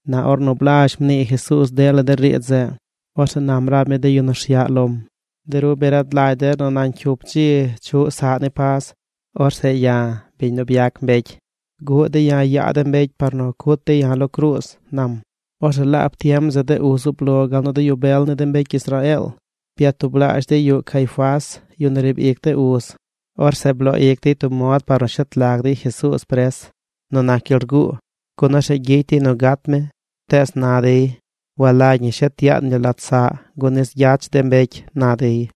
Na ornu blazh mnii Jesuuz dela de riidz zeꞌ, orzeꞌ nam rab mi de yu nu rsyaꞌ lom: ―De ru bi rad lagy der nu nañ cyup dzi chuꞌ saꞌ ni Pas. Orzeꞌ ya̱, biñ nu byac mbecy, guꞌ dey ya̱ yaa de mbecy par nu cut dey ya̱ lo cruuz ―nam. Orzeꞌ laab tiem zeꞌ de uz zub lo gal nu de yu bel ni de mbecy Israeel byatublaazh dey yuꞌ Caifás, yu nu riib ic de uz. Orzeꞌ bloo ic dey tub mod par nu shet lag dey Jesuuz pres nu nac gyel rguu, gun orzeꞌ gyicy dey nu gat mi. Tees na dey: ―Walagy ñi shet yaan yu lat saꞌ gun nis gyach de mbecy ―na dey.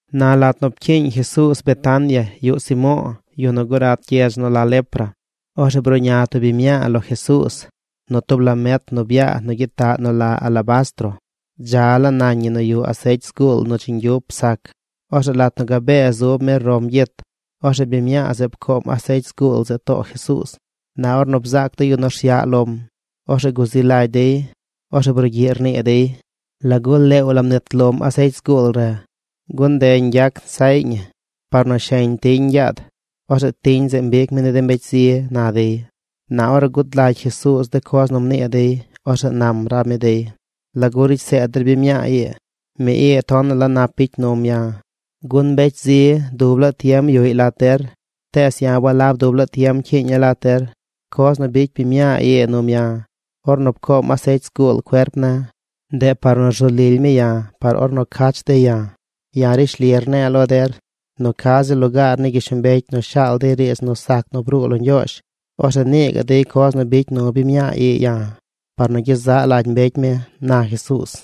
Na lat nu pcyiiñ Jesuuz Betania yuꞌ Simo̱o̱, yu nu gurat gyedz nu la lepra, orzeꞌ bruꞌña tub biñ mñaa lo Jesuuz nu tub lamet nu byaa nu gyitaꞌ nu la alabastro. Dza laa nañ ñi nu yuꞌ asecy zguul nu dzi ñgyup sac. Orzeꞌ lat nu gabee zub mi rom gyit, orzeꞌ biñ mñaa zeꞌ pcoom asecy zguul zeꞌ too Jesuuz. Na ornu bzaac de yu nu rsyaꞌ lom, orzeꞌ guzi lagy dey. Orzeꞌ brugyiꞌ rnii dey: ―¿Lagu leew la mnit lom asecy zguul re? Gun nde ñgyac nsaꞌy ñi par nu sheñ tiñ ñgyaad. Orzeꞌ tiñ zeꞌ mbic mi ni de mbecy zi ―na dey. Na ornu gud lagy Jesuuz de coz nu mnii dey, orzeꞌ nam rab mi dey: ―¿Lagu ricy seed der biñ mñaa ii? Mi ii tonaꞌ la nap bicy num ya̱. Gun mbecy zi dub laa tiem yuꞌy lat der. Tees ya̱ walab dub laa tiem cyiiña̱ lat der. Coz nu bicy biñ mñaa ii num ya̱ ornu pcoom asecy zguul cuerp ne̱, ndeꞌ par nu rzu lily mi ya̱ par ornu cach dey ya̱. Ya̱ rishli rne̱e̱ lo der nu ca ziꞌl lugaar ni gyishlombecy nu shaal dey riidz nu sac nu bruu lo Ñgyoozh, orzeꞌ nii gaꞌ dey coz nu bicy nu biñ mñaa ii ya̱ par nu gyezaꞌ lagy mbecy mi ―na Jesuuz.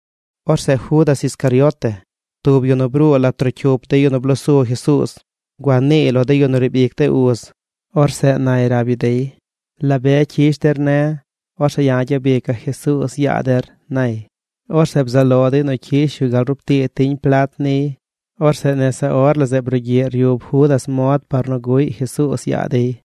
Orzeꞌ Judas Iscariote, tub yu nu bruu lat trocyup de yu nu blosu Jesuuz, gua niiy lo de yu nu riib ic de uz. Orzeꞌ nay rab yu dey: ―¿La be cyish der ne̱, orzeꞌ ya̱ gyabica̱ Jesuuz yaa der? ―nay. Orzeꞌ bzaꞌ lo dey nu cyish yu gal rub tii tiñ plat niy. Orzeꞌ nese or la zeꞌ brugyiꞌ ryub Judas mod par nu guꞌy Jesuuz yaa dey.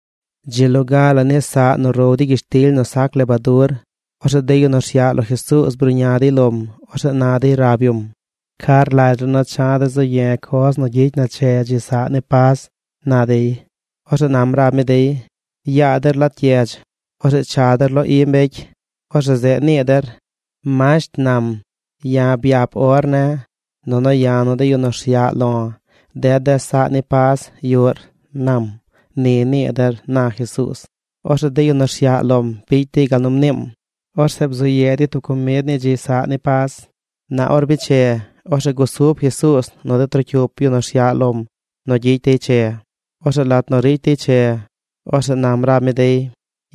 Dzi loga ni saꞌ nu row dey gyishtily nu sac lebadur, orzeꞌ de yu nu rsyaꞌ lo Jesuuz bruꞌña dey lom. Orzeꞌ na dey rab yum: ―¿Ca rlagy ru nu cha̱ de̱ zu ye̱ coz nu gyicy na che dzi saꞌ ni Pas? ―na dey. Orzeꞌ nam rab mi dey: ―Yaa der lat gyedz. Orzeꞌ cha der lo i mbecy. Orzeꞌ zeꞌ nii der: “Masht nam: Ya̱ byap or ne̱, nunu ya̱ nu de yu nu rsyaꞌ lo̱ ded de̱ saꞌ ni Pas yuꞌr, nam.” Ni nii der ―na Jesuuz. Orzeꞌ de yu nu rsyaꞌ lom bicy dey gal nu mniim. Orzeꞌ bzu ye dey tub comid ni dzi saꞌ ni Pas. Na or biche, orzeꞌ gusub Jesuuz nu de trocyup yu nu rsyaꞌ lom nu gyicy dey che. Orzeꞌ lat nu ricy dey che, orzeꞌ nam rab mi dey: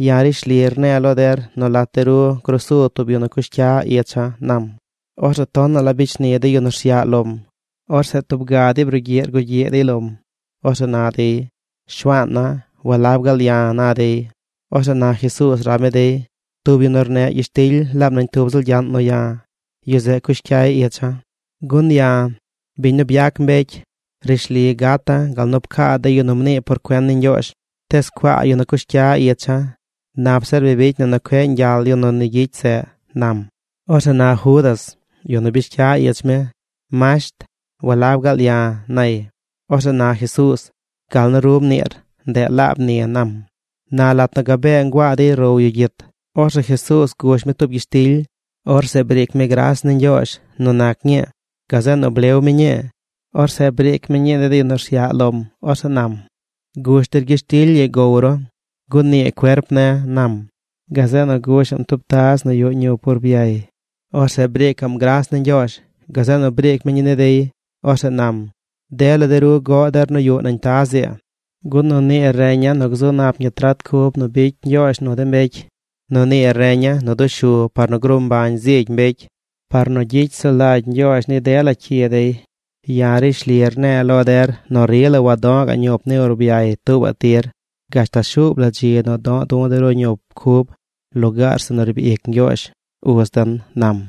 ―Ya̱ rishli rne̱e̱ lo der nu lat de ru gruu su tub ru nu cush cyar icha̱ ―nam. Orzeꞌ tonaꞌ la bicy shni de yu nu rsyaꞌ lom. Orzeꞌ tub ga dey brugyiꞌ rgugyiꞌ dey lom. Orzeꞌ na dey: ―Shuaana̱, ¿walab gaal ya̱? ―na dey. Orzeꞌ na Jesuuz rab mi dey: ―Tub yu nu rneꞌ gyishtily laab nañ tub ziꞌl gyaꞌn nu ya̱, yu zeꞌ cush cyaꞌy icha̱. Gun ya̱, biñ nu byac mbecy, rishli gata̱ gal nu pcaa de yu nu mnii por cuen ni Ñgyoozh. ¡Tees cuaa yu nu cush cya icha̱! Nap zir bi bicy na nu cueꞌ ñgyal yu nu ni gyicy zeꞌ ―nam. Orzeꞌ na Judas, yu nu bish cya ich mi: ―Masht, ¿walab gaal ya̱? ―nay. Orzeꞌ na Jesuuz: ―Gal nu ru mniir, ndeꞌ laab ni ―nam. Na lat nu gabee nguaa dey row yu gyit, orzeꞌ Jesuuz gush mi tub gyishtily. Orzeꞌ briic mi gras ni Ñgyoozh nu nac ñii. Gazeꞌ nu blew mi ñii. Orzeꞌ briic mi ñii ni de yu nu rsyaꞌ lom. Orzeꞌ nam: ―Gush der gyishtily ii gow ru, gun nii cuerp ne̱ ―nam. Gazeꞌ nu gusha̱ꞌm tub taz nu yuꞌ ñup urbyay. Orzeꞌ briicaꞌm gras ni Ñgyoozh. Gazeꞌ nu briic mi ñii ni dey. Orzeꞌ nam: ―Dela de ru goꞌ der nu yuꞌ nañ taz ii. Gun nu nii reña̱ nu gzu nap ñi trat cub nu bicy Ñgyoozh nu de mbecy. Nu nii reña̱ nu dushu par nu gruu mbañ zigy mbecy, par nu gyicy sulagy Ñgyoozh ni dela cyi dey. Ya̱ rishli rne̱e̱ lo der nu rila wadoꞌ ga̱ꞌ ñup ni urbyay tuubaꞌ tir gashtal shuub la dzi nu do̱ꞌ du̱ de ru ñup cub lugaar zeꞌ nu riib ic Ñgyoozh, uz den ―nam.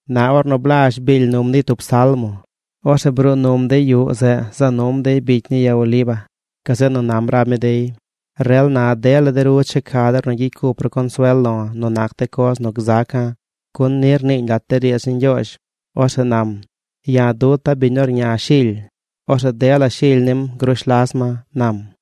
Na ornu blazh biil num dey tub Salmo, orzeꞌ bruu num dey yuꞌ zeꞌ za num dey bicy ni ya Oliva. Gazeꞌ nu nam rab mi dey: ―Rel na dela de ru checa der nu gyicy cup ru consuel lo̱ nu nac de coz nu gzaca̱, gun ni rniiñ lat de riidz ni Ñgyoozh. Orzeꞌ nam: “Ya̱ duta̱ biñ nu rña shily, orzeꞌ dela shily nim grush las ma”, nam.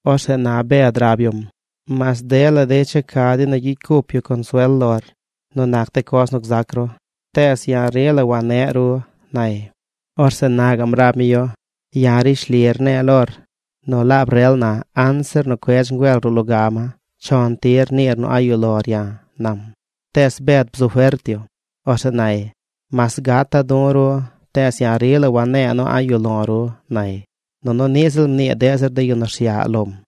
Orzeꞌ na Bed rab yum: ―Mas dela dey checa dey nu gyicy cup dey consuel lor nu nac de coz nu gzac ru, tees ya̱ rila wane̱ꞌ ru ―nay. Orzeꞌ na gaꞌm rab mi yu: ―Ya̱ rishli rne̱e̱ lor nu laab rel na, anzir nu cuedz ngüel ruꞌ loga ma, chon tir niir nu a̱ꞌ yuꞌ lor ya̱ ―nam. Tees Bed bzu fert yu. Orzeꞌ nay: ―Mas gata̱ du̱ ru, tees ya̱ rila wane̱e̱ nu a̱ꞌ yuꞌ lo̱ ru ―nay. Nunu niꞌ ziꞌl mnii deꞌ zir de yu nu rsyaꞌ lom.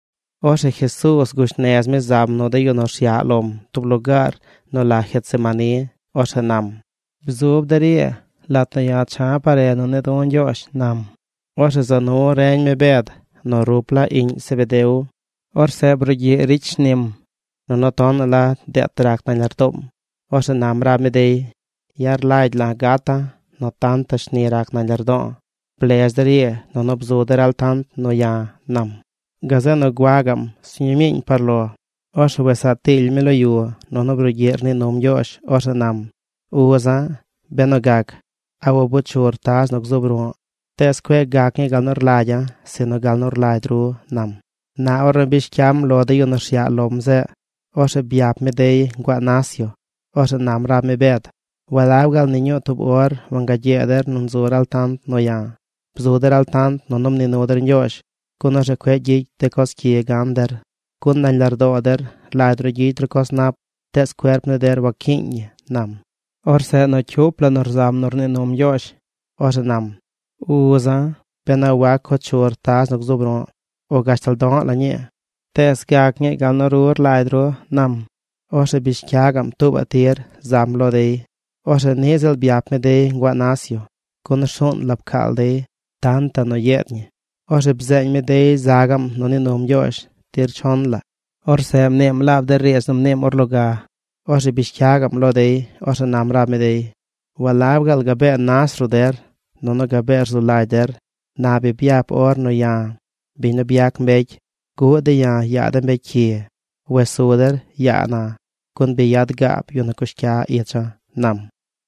Orzeꞌ Jesuuz gush nez mi zam nu de yu nu rsyaꞌ lom tub lugaar nu la Getsemaní. Orzeꞌ nam: ―Bzub der ii lat nu ya̱ cha̱ par re nu ne̱e̱ du̱ Ñgyoozh ―nam. Orzeꞌ za nu reñ mi Bed nu rup laa iꞌñ Zebedeo. Orzeꞌ brugyiꞌ ricy shnim, nunu tonaꞌ la deet rac nañ lardoom. Orzeꞌ nam rab mi dey: ―Ya̱ rlagy la̱ gata̱ nu tantaꞌ shni rac nañ lardo̱o̱. Blez der ii nunu bzu der altant nu ya̱ ―nam. Gazeꞌ nu gua gaꞌm sñuu miiñ par lo. Orzeꞌ wes saa tiily mi lo yu nunu brugyiꞌ rnii num Ñgyoozh. Orzeꞌ nam: ―Uza̱, benu gac, ¿a wabo chur taz nu gzuub ruꞌ? Tees cueꞌ gac ñii gal nu rlagya̱ sinu gal nu rlagy ru ―nam. Na ornu bish cyam lo de yu nu rsyaꞌ lom zeꞌ, orzeꞌ byap mi dey nguaa nas yu. Orzeꞌ nam rab mi Bed: ―¿Walab gaal ni ñuu tub or wangagyee der nu nzu der altant nu ya̱? Bzu der altant nunu mnii nu der Ñgyoozh, gun orzeꞌ cueꞌ gyicy de coz cyi gan der. Gun nañ lardoo der rlagy ru gyicy ru coz nap tees cuerp ni der wacyiiñ ñi ―nam. Orzeꞌ nu cyup la nu rzam nu rnii num Ñgyoozh, orzeꞌ nam: ―Uza̱, ben a wac co chur taz nu gzuub ru̱ꞌ o gashtal do̱ꞌ la ñii, tees gac ñii gal nu ru rlagy ru ―nam. Orzeꞌ bish cya gaꞌm tuubaꞌ tir zam lo dey. Orzeꞌ niꞌ ziꞌl byap mi dey nguaa nas yu, gun rsuun la pcaal dey tantaꞌ nu yeed ñi. Orzeꞌ bzeeñ mi dey za gaꞌm nu nii num Ñgyoozh tir chon la. Orzeꞌ mniim laab de riidz nu mniim or loga. Orzeꞌ bish cya gaꞌm lo dey. Orzeꞌ nam rab mi dey: ―¿Walab gaal gabee nas ruꞌ der nunu gabee rzu lagy der? Na bi ryap or nu ya̱, biñ nu byac mbecy, guꞌ dey ya̱ yaa de mbecy cyi. Wes su der yaa na. Gun bi yad gaab yu nu cush cya icha̱ ―nam.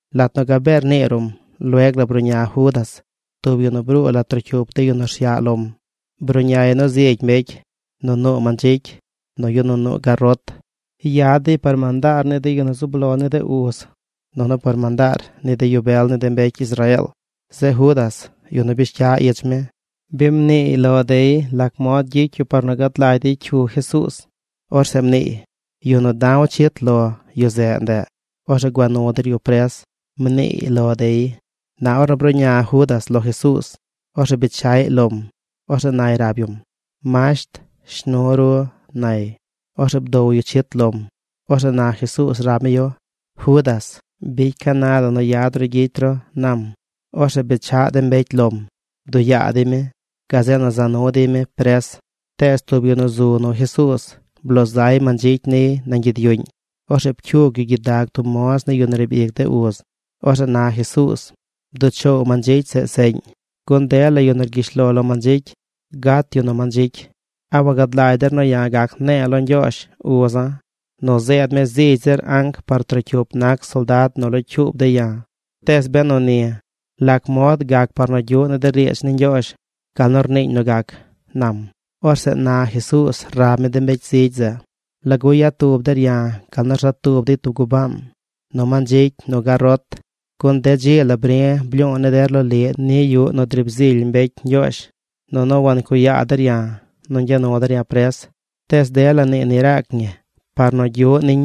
Lat nu gabee rnii ruꞌm, lueg la bruꞌña Judas, tub yu nu bruu lat trocyup de yu nu rsyaꞌ lom. Bruꞌñay nu zigy mbecy nu nuu mandzicy, nu yu nu nuu garot. Yad dey par mandaar ni de yu nu zub lo ni de uz, nunu par mandaar ni de yu bel ni de mbecy Israeel. Zeꞌ Judas, yu nu bish cya ich mi, bi mniiy lo dey lac mod gyicy yu par nu gad lagy dey cyu Jesuuz. Orzeꞌ mniiy: ―Yu nu da̱w chit lo, yu zeꞌ ndeꞌ. Orzeꞌ gua nu der yu pres ―mniiy lo dey. Na ornu bruꞌña Judas lo Jesuuz, orzeꞌ bechaꞌy lom. Orzeꞌ nay rab yum: ―¡Masht, shnu ru! ―nay. Orzeꞌ bdow yu chit lom. Orzeꞌ na Jesuuz rab mi yu: ―Judas, bicy ca na la nu yad ru gyicy ru ―nam. Orzeꞌ bechaꞌ de mbecy lom. Bduꞌ yaa dey mi. Gazeꞌ nu za nu dey mi pres. Tees tub yu nu zu nu Jesuuz bloo zay mandzicy niy nañ gyid yuꞌñ. Orzeꞌ pcyug yu gyidag tub moz ni yu nu riib ic de uz. Orzeꞌ na Jesuuz: ―Bduꞌ choow mandzicy zeꞌ seꞌñ gun dela yu nu rgyish lo lo mandzicy gat yu nu mandzicy. ¿A wagad lagy der nu ya̱ gac ne̱e̱ lo Ñgyoozh, uza̱, nu zeed mi zigy zir anc par trocyup nac soldad nu locyuub dey ya̱? Tees benu ni, ¿lac mod gac par nu gyuꞌ ni de riidz ni Ñgyoozh gal nu rniiñ nu gac? ―nam. Orzeꞌ na Jesuuz rab mi de mbecy zigy zeꞌ: ―¿Lagu yad tub der ya̱ gal nu rza tub dey tub gubaan: nu mandzicy nu garot? Gun de dzi la bri̱ blyu̱u̱ ni der loliꞌ ni yuꞌ nu driib zily mbecy Ñgyoozh. Nunu wancuꞌ yaa der ya̱ nu ñgya nu der ya̱ pres. Tees dela nii ni raac ñi par nu gyuꞌ niñ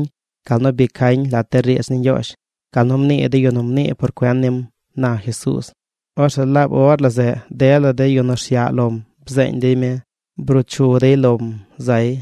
gal nu bi cañ lat de riidz ni Ñgyoozh, gal nu mnii de yu nu mnii por cuen nim ―na Jesuuz. Orzeꞌ laab or la zeꞌ dela de yu nu rsyaꞌ lom bzeeñ dey mi. Bruu chu dey lom zay.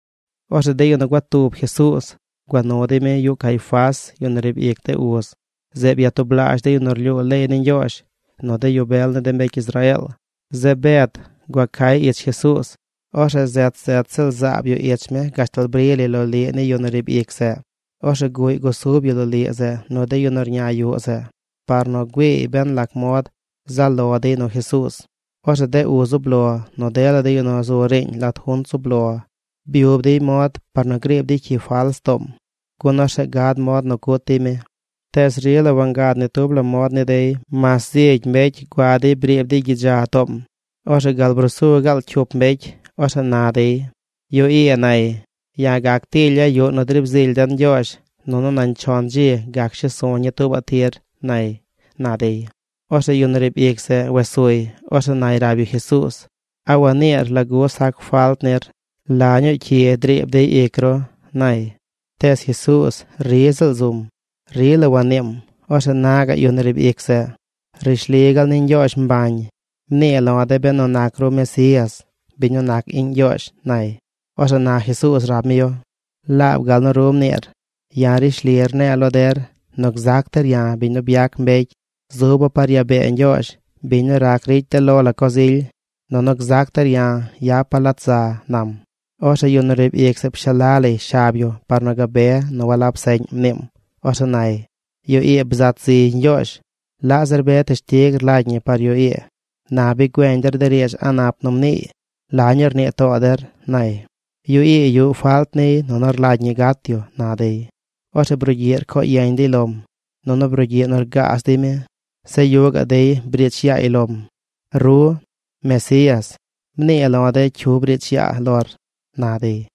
Orzeꞌ de yu nu gua tub Jesuuz gua nu dey mi yuꞌ Caifás, yu nu riib ic de uz. Zeꞌ byatublaazh de yu nu rlyuu leey ni Ñgyoozh, nu de yu bel ni de mbecy Israeel. Zeꞌ Bed gua cay ich Jesuuz. Orzeꞌ zet zet ziꞌl zaab yu ich mi gashtal bri lay loliꞌ ni yu nu riib ic zeꞌ. Orzeꞌ guꞌy gusub yu loliꞌ zeꞌ nu de yu nu rña yuꞌ zeꞌ par nu güiiy ben lac mod zaꞌ lo dey nu Jesuuz. Orzeꞌ de uz zub lo, nu dela de yu nu zu riiñ lat junt zub lo byub dey mod par nu griib dey cyi fals toom, gun orzeꞌ gad mod nu cut dey mi. Tees rila wangad ni tub la mod ni dey mas zigy mbecy gua dey briib dey gyidza toom. Orzeꞌ gal brusu gaal cyup mbecy. Orzeꞌ na dey: ―Yu ii nay: “Ya̱ gac tilya̱ yuꞌ nu driib zily den Ñgyoozh, nunu nañ chon dzi gac shes su̱ ñii tuubaꞌ tir”, nay ―na dey. Orzeꞌ yu nu riib ic zeꞌ wes suy, orzeꞌ nay rab yu Jesuuz: ―¿A waniir lagu sac falt nir? ¿La ñuu cyi driib dey ic ru? ―nay. Tees Jesuuz ri ziꞌl zum. Rila waniim. Orzeꞌ na gaꞌ yu nu riib ic zeꞌ: ―Rishli gaal ni Ñgyoozh mbañ, mnii lo̱ de̱ benu nac ru Mesías, biñ nu nac iꞌñ Ñgyoozh ―nay. Orzeꞌ na Jesuuz rab mi yu: ―Laab gal nu ru mniir. Ya̱ rishli rne̱e̱ lo der nu gzac der ya̱, biñ nu byac mbecy, zuba̱ par yaa bee Ñgyoozh, biñ nu rac ricy de lo la coz ily. Nunu gzac der ya̱ yapa̱ lat za ―nam. Orzeꞌ yu nu riib ic zeꞌ pshala lay shab yu par nu gabe nu walab seꞌñ mniim. Orzeꞌ nay: ―Yu ii bzat ziy Ñgyoozh. ¿Laꞌ zir be teshtig rlagy ñi par yu ii? Na bi güeñ der de riidz a̱ꞌ nap nu mniiy. ¿La ñuu rnii too der? ―nay. ―Yu ii yuꞌ falt niy nunu rlagy ñi gat yu ―na dey. Orzeꞌ brugyiꞌ rcoo yeñ dey lom. Nunu brugyiꞌ nu rgaaz dey mi. Zeꞌ yuꞌ gaꞌ dey briich yaay lom. ―Ru, Mesías, ¡mnii lo̱ de̱ cyu briich yaa lor! ―na dey.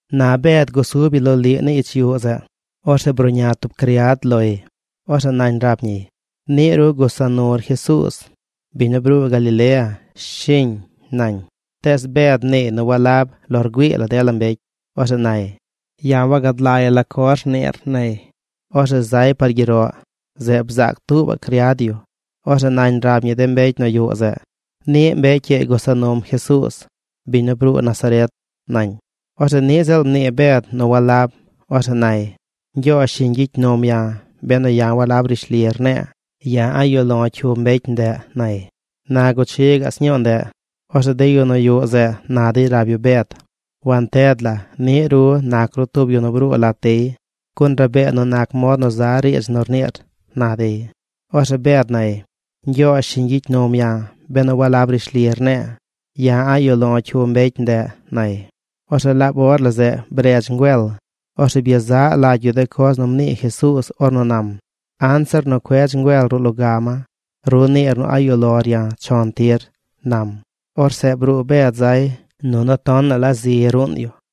Na Bed gusub yu loliꞌ ni ich yuꞌ zeꞌ. Orzeꞌ bruꞌña tub criad loy. Orzeꞌ nañ rab ñiy: ―Niꞌ ru gusa nur Jesuuz, biñ nu bruu Galilea, ¿shiñ? ―nañ. Tees Bed mniiy nu walab lo rgüii la dela mbecy. Orzeꞌ nay: ―Ya̱ wagad lagya̱ la coz rniir ―nay. Orzeꞌ zay par gyeroꞌ. Zeꞌ bzaac tuubaꞌ criad yu. Orzeꞌ nañ rab ñi de mbecy nu yuꞌ zeꞌ: ―Niꞌ mbecy ii gusa num Jesuuz, biñ nu bruu Nazaret ―nañ. Orzeꞌ niꞌ ziꞌl mnii Bed nu walab. Orzeꞌ nay: ―Ñgyoozh shiñ gyicy num ya̱ benu ya̱ walab rishli rne̱e̱. ¡Ya̱ a̱ꞌ yuꞌ lo̱ cyu mbecy ndeꞌ! ―nay. Na guchi gaꞌ sñuu ndeꞌ, orzeꞌ de yu nu yuꞌ zeꞌ na dey rab yu Bed: ―Wanted la niꞌ ru nac ru tub yu nu bruu lat dey, gun rabee nu nac mod nu za riidz nu rniir ―na dey. Orzeꞌ Bed nay: ―Ñgyoozh shiñ gyicy num ya̱ benu walab rishli rne̱e̱. ¡Ya̱ a̱ꞌ yuꞌ lo̱ cyu mbecy ndeꞌ! ―nay. Orzeꞌ laab or la zeꞌ bredz ngüel. Orzeꞌ byezaꞌ lagy yu de coz nu mnii Jesuuz ornu nam: “Anzir nu cuedz ngüel ruꞌ loga ma, ru niir nu a̱ꞌ yuꞌ lor ya̱ chon tir” ―nam. Orzeꞌ bruu Bed zay. Nunu tonaꞌ la zi ruun yu.